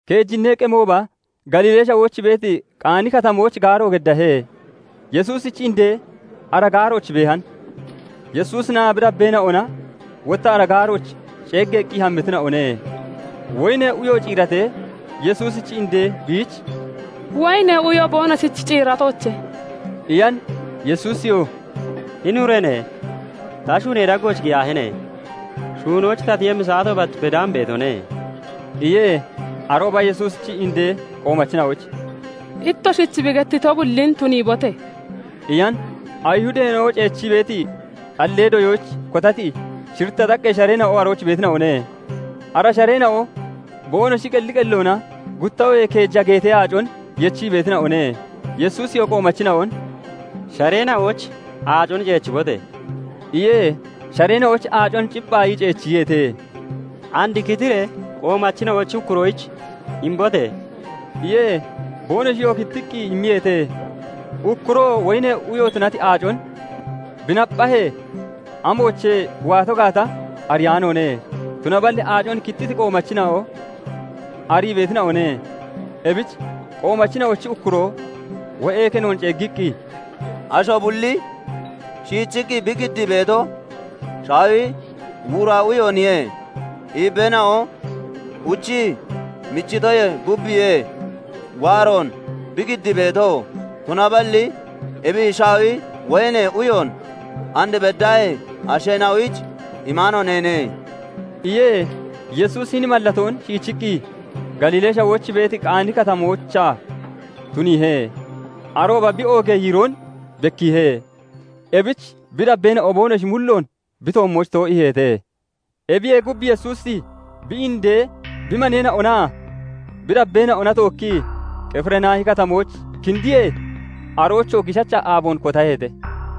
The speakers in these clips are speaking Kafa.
Keejinnee qemooba Galiilee Shawooch beeti Qaani Katamooch gaaro geddeehe. Yesuusichi indee ara gaarooch beehan. Yesuusinaa bi dabbeena'ona wotta ara gaarooch ceeggeeqqi hammitina'one. Woyinee uyo ciiratee, Yesuusichi indee biich "Woyinee uyo boonoshich ciiratoche!" iyan. Yesuusiyoo "Hini ureene! Ta shuunee daggooch giyaahine! Shuunoyich ta tiyemmi saato bat bedaan beetone" iye. Arooba Yesuusichi indee qoomachina'oyich "Ittoshich bi gettiyo bullin tuniibote!" iyan. Ayihudeena'o ceechii beeti xallee doyoyich kotati shiritta xaqqee shareena'o (gaaneena'o) arooch beetina'one; ara shareena'oo boonoshi qelli qelloona gutta oohee keeja geetee aacon yechii beetina'one. Yesuusiyoo qoomachina'on "Shareena'ooch aacon ceechibote!" iye. Shareena'ooch aacon cipphaayii ceechiyeete. "And kitiree qoomachina'ochi ukkuroyich imbote!" iye. Boonoshiyoo kittiqqi immiyeete. Ukkuroo woyinee uyo tunati aacon bi napphahee, amoochee bi waato gaata ariyaanoone; tunaballi aacon kittiti qoomachina'o arii beetina'one. Ebich qoomachina'ochi ukkuroo wo'ee kenoon ceeggiqqi, "Asho bulli shiichiqqi bi giddii beeto shaawi wuura uyooniye; iibbeena'o uchii michitoyee gubbiye waaroon bi giddii beeto; tunaballi ebi shaawi woyinee uyoon and beddaahee asheena'oyich imaano neene" iye. Yesuusi hini mallatoon shiichiqqi Galiilee Shawooch beeti Qaani Katamoochaa tuniihe; arooba bi oogee yiiroon bekkiihe. Ebich bi dabbeena'o boonoshi mulloon bi toommooch too'iiheete. Ebiyee gub Yesuusi bi inde, bi maneena'onaa bi dabbeena'ona tookkii Qifirnaahi Katamooch kindiye; aroochoo giishacha aaboon kotaheete.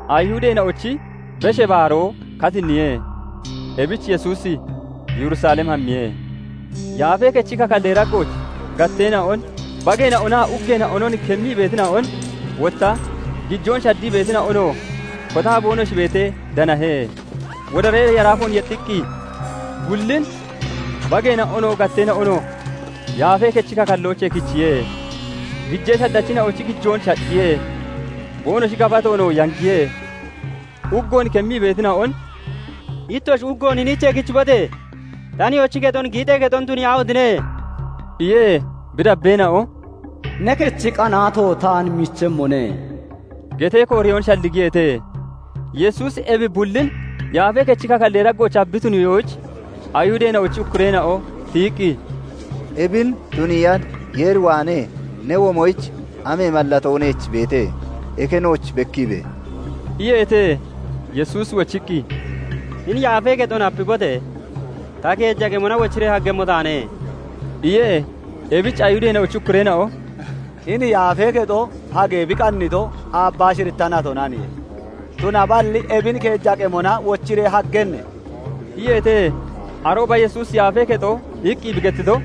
Ayihudeena'ochi Beshee Baaroo katinniye. Ebich Yesuusi Yerusalem hammiye. Yaafee Kechi kakallee daggooch gatteena'on, bageena'onaa uggeena'onon kemmii beetina'on, wotta gijoon shaddii beetina'onoo kotaa boonoshi beetee danahe. Wodaree yaraafoon yexxiqqi (wodariqqi) bullin, bageena'onoo, gatteena'onoo, Yaafee Kechi kakalloochee kichiye; gijee shaddachina'ochi gijoon shacciye; boonoshi gafatoon yangiye; uggoon kemmii beetina'on "Ittoshi uggoon hiniichee kichibote! Ta Nihoochi kexon giixee kexon tuniyaahotine!" iye. Bi dabbeena'o "Ne kechi qanaato taan michemmone" getee kooreyoon shalligiyeete. Yesuusi ebi bullin yaafee kechi kakallee daggoochaa bi tuniitoyich, Ayihudeena'ochi ukkureena'o tiyiqqi, "Ebin tuniiya Yeer waanee ne womoyich amee mallatoo neech beete? Eke nooch bekkiibe!" iyeete. Yesuusi wochiqqi, "Hini yaafee kexon hapibote! Ta keeja qemona wochiree haggemmo taane" iye. Ebich Ayihudeena'ochi ukkureena'o "Hini yaafee kexo hagee bi qannito aabbaa shiritta natonaniye; tunaballi ebin keeja qemona wochiree haggenne?" iyeete. Arooba Yesuusi "Yaafee kexo" iqqi bi gettito,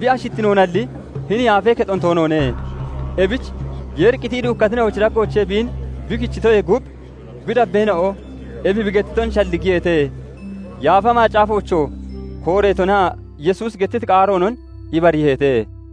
bi ashittinoonalli hini yaafee kexon toonoone. Ebich Yeeri qitii duukkatina'ochi daggoochee biin bi kichitoyee gub, bi dabbeena'o ebi bi gettiton shalligiyeete; Yaafa Macaafoochoo kooreetonaa Yesuusi gettiti qaaroonon ibariiheete.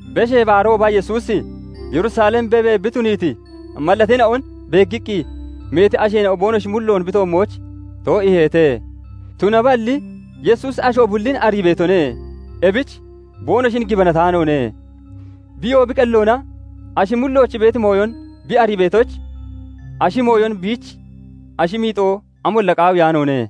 Beshee Baarooba, Yesuusi Yerusalem beebee bi tuniiti mallateena'on beeggiqqi meeti asheena'o boonoshi mulloon bi toommooch too'iiheete. Tunaballi Yesuusi asho bullin arii beetone; ebich boonoshin gibanataanoone. Biyoo bi qelloona ashi mullooch beeti mooyon bi arii beetoyich, ashi mooyon biich ashi miixo amolla qaawiyaanoone.